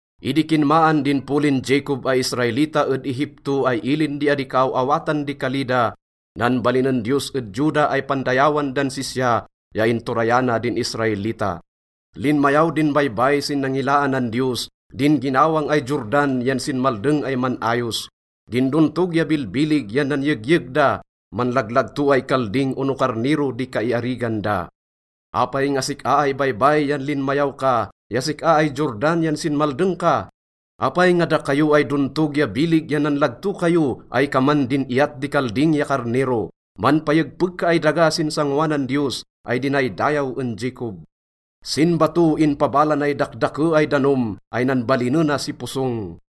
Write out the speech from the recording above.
Idi kinmaan din polin Jacob ay Israelita ed Egipto ay ilin di adi kaaw-awatan di kali da, nanbalinen Diyos ed Juda ay pandayawan dan sisya, ya inturayana din Israelita. Linmayaw din baybay sin nangilaanan Diyos, din ginawang ay Jordan yan sinmaldeng ay man-ayos. Din dontog ya bilbilig yan nanyegyeg da, manlaglagto ay kalding ono karnero di kaiarigan da. Apay nga sik-a ay baybay yan linmayaw ka, ya sik-a ay Jordan yan sinmaldeng ka? Apay nga dakayo ay dontog ya bilig yan nanlagto kayo ay kaman din iyat di kalding ya karnero? Manpayegpeg ka ay daga sin sangoanan Diyos ay dinaydayaw en Jacob. Sin bato inpabala nay dakdake ay danom ay nanbalinena si posong.